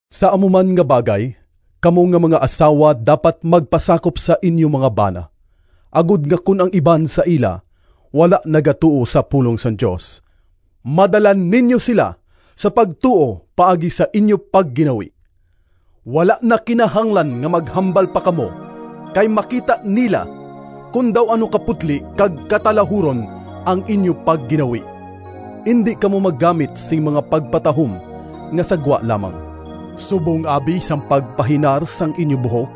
Sa amo man nga bagay, kamo nga mga asawa dapat magpasakop sa inyo mga bana, agod nga kon ang iban sa ila wala nagatuo sa pulong sang Dios, madala ninyo sila sa pagtuo paagi sa inyo pagginawi. Wala na kinahanglan nga maghambal pa kamo, kay makita nila kon daw ano kaputli kag katalahuron ang inyo pagginawi. Indi kamo maggamit sing mga pagpatahom nga sa gwa lamang, subong abi sang pagpahinar sang inyo buhok,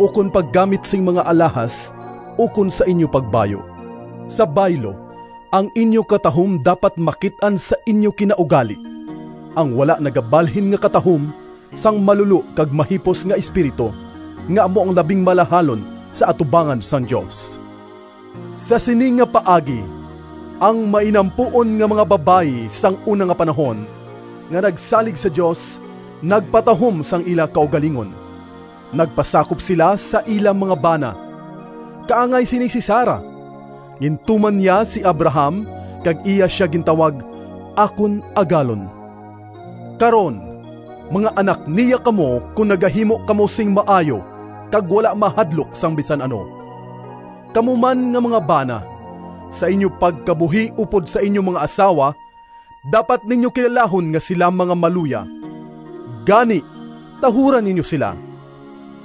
ukon paggamit sing mga alahas ukon sa inyo pagbayu. Sa baylo, ang inyo katahom dapat makit-an sa inyo kinaugali, ang wala nagabalhin nga katahom sang malulo kag mahipos nga espiritu, nga amo ang labing malahalon sa atubangan sang Dios. Sa sini nga paagi, ang mainampuon nga mga babayi sang una nga panahon nga nagsalig sa Dios, nagpatahom sang ila kaugalingon. Nagpasakop sila sa ila mga bana. Kaangay sini si Sara. Gintuman niya si Abraham kag iya sia gintawag “Akon agalon.” Karon mga anak niya kamo kon nagahimo kamo sing maayo kag wala mahadlok sang bisan ano. Kamo man nga mga bana, sa inyo pagkabuhi upod sa inyo mga asawa, dapat ninyo kilalahon nga sila mga maluya. Gani, tahura ninyo sila.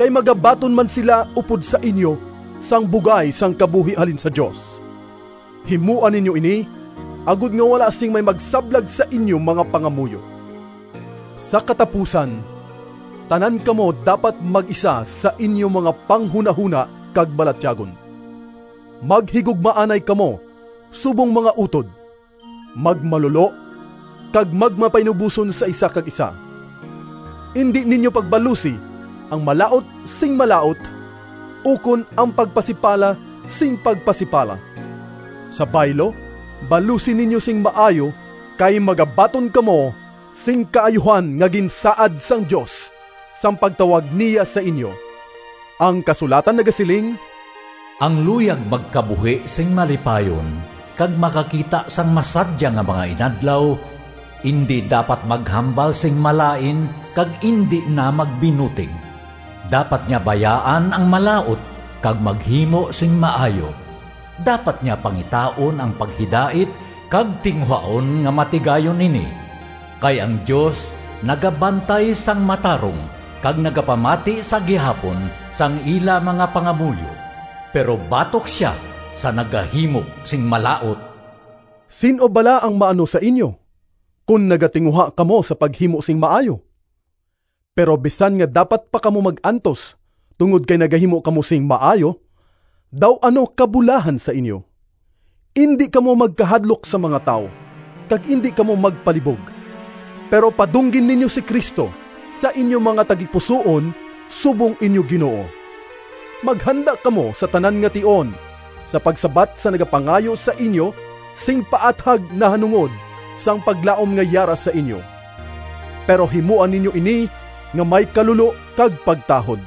Kay magabaton man sila upod sa inyo sang bugay sang kabuhi halin sa Dios. Himoa ninyo ini, agod nga wala sing may magsablag sa inyo mga pangamuyo. Sa katapusan, tanan kamo dapat mag-isa sa inyo mga panghunahona kag balatyagon. Maghigugmaanay kamo subong mga utod, magmalulo kag magmapainuboson sa isa kag isa. Indi ninyo pagbalusi ang malaut sing malaut, ukon ang pagpasipala sing pagpasipala. Sa baylo balusi ninyo sing maayo, kay magabaton kamo sing kaayuhan nga ginsaad sang Dios sang pagtawag niya sa inyo. Ang kasulatan nagasiling: “Ang luyag magkabuhi sing malipayon Kag makakita sang masadya Nga mga inadlaw, Indi dapat maghambal sing malain Kag indi na magbinutig. Dapat niya bayaan ang malaut, Kag maghimo sing maayo, Dapat niya pangitaon ang paghidait Kag tinguhaon nga matigayon ini. Kay ang Dios nagabantay sang matarong Kag nagapamati sa gihapon Sang ila mga pangamuyo; Pero batok sia sa nagahimo sing malaut.” Sin-o bala ang maano sa inyo, kon nagatinguha kamo sa paghimo sing maayo? Pero bisan nga dapat pa kamo mag-antos tungod kay nagahimo kamo sing maayo, daw ano kabulahan sa inyo! Indi kamo magkahadlok sa mga tawo, kag indi kamo magpalibog. Pero padunggi ninyo si Cristo sa inyo mga tagipusoon subong inyo Ginoo. Maghanda kamo sa tanan nga tion sa pagsabat sa nagapangayo sa inyo sing paathag nahanungod sang paglaom nga yara sa inyo. Pero himoa ninyo ini nga may kalulo kag pagtahod.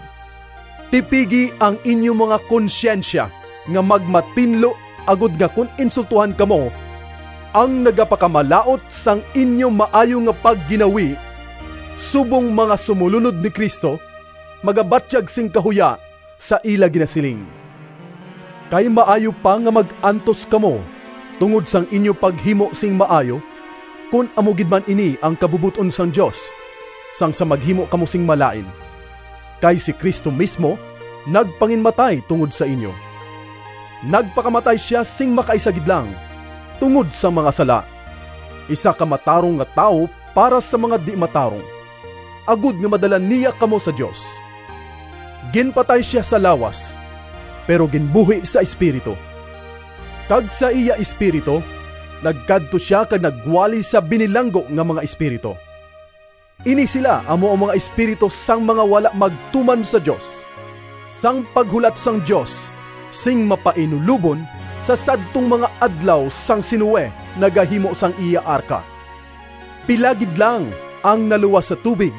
Tipigi ang inyo mga konsyensya nga magmatinlo, agod nga kon insultohan kamo, ang nagapakamalaut sang inyo maayo nga pagginawi subong mga sumolunod ni Cristo, magabatyag sing kahuya sa ila ginasiling. Kay maayo pa nga mag-antos kamo tungod sang inyo paghimo sing maayo, kon amo gid man ini ang kabubot-on sang Dios, sang sa maghimo kamo sing malain. Kay si Cristo mismo nagpanginmatay tungod sa inyo. Nagpakamatay sia sing makaisa gid lang tungod sang mga sala, isa ka matarong nga tawo para sa mga di-matarong, agod nga madala niya kamo sa Dios. Ginpatay sia sa lawas, pero ginbuhi sa espiritu. Kag sa iya espiritu nagkadto sia kag nagwali sa binilanggo nga mga espiritu. Ini sila amo ang mga espiritu sang mga wala magtuman sa Dios, sang paghulat sang Dios sing mapainulobon sa sadtong mga adlaw sang si Noe nagahimo sang iya arka. Pila gid lang ang naluwas sa tubig,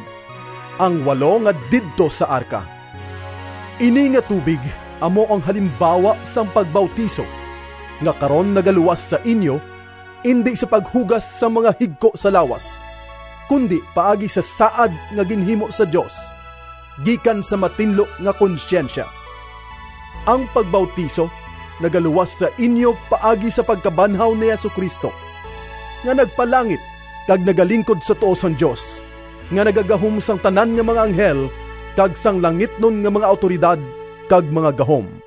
ang walo nga didto sa arka. Ini nga tubig amo ang halimbawa sang pagbautiso, nga karon nagaluwas sa inyo, indi sa paghugas sang mga higko sa lawas, kundi paagi sa saad nga ginhimo sa Dios gikan sa matinlo nga konsyensya. Ang pagbautiso nagaluwas sa inyo paagi sa pagkabanhaw ni Jesu-Cristo, nga nagpalangit kag nagalingkod sa tuo sang Dios, nga nagagahom sang tanan nga mga anghel kag sang langitnon nga mga awtoridad kag mga gahom.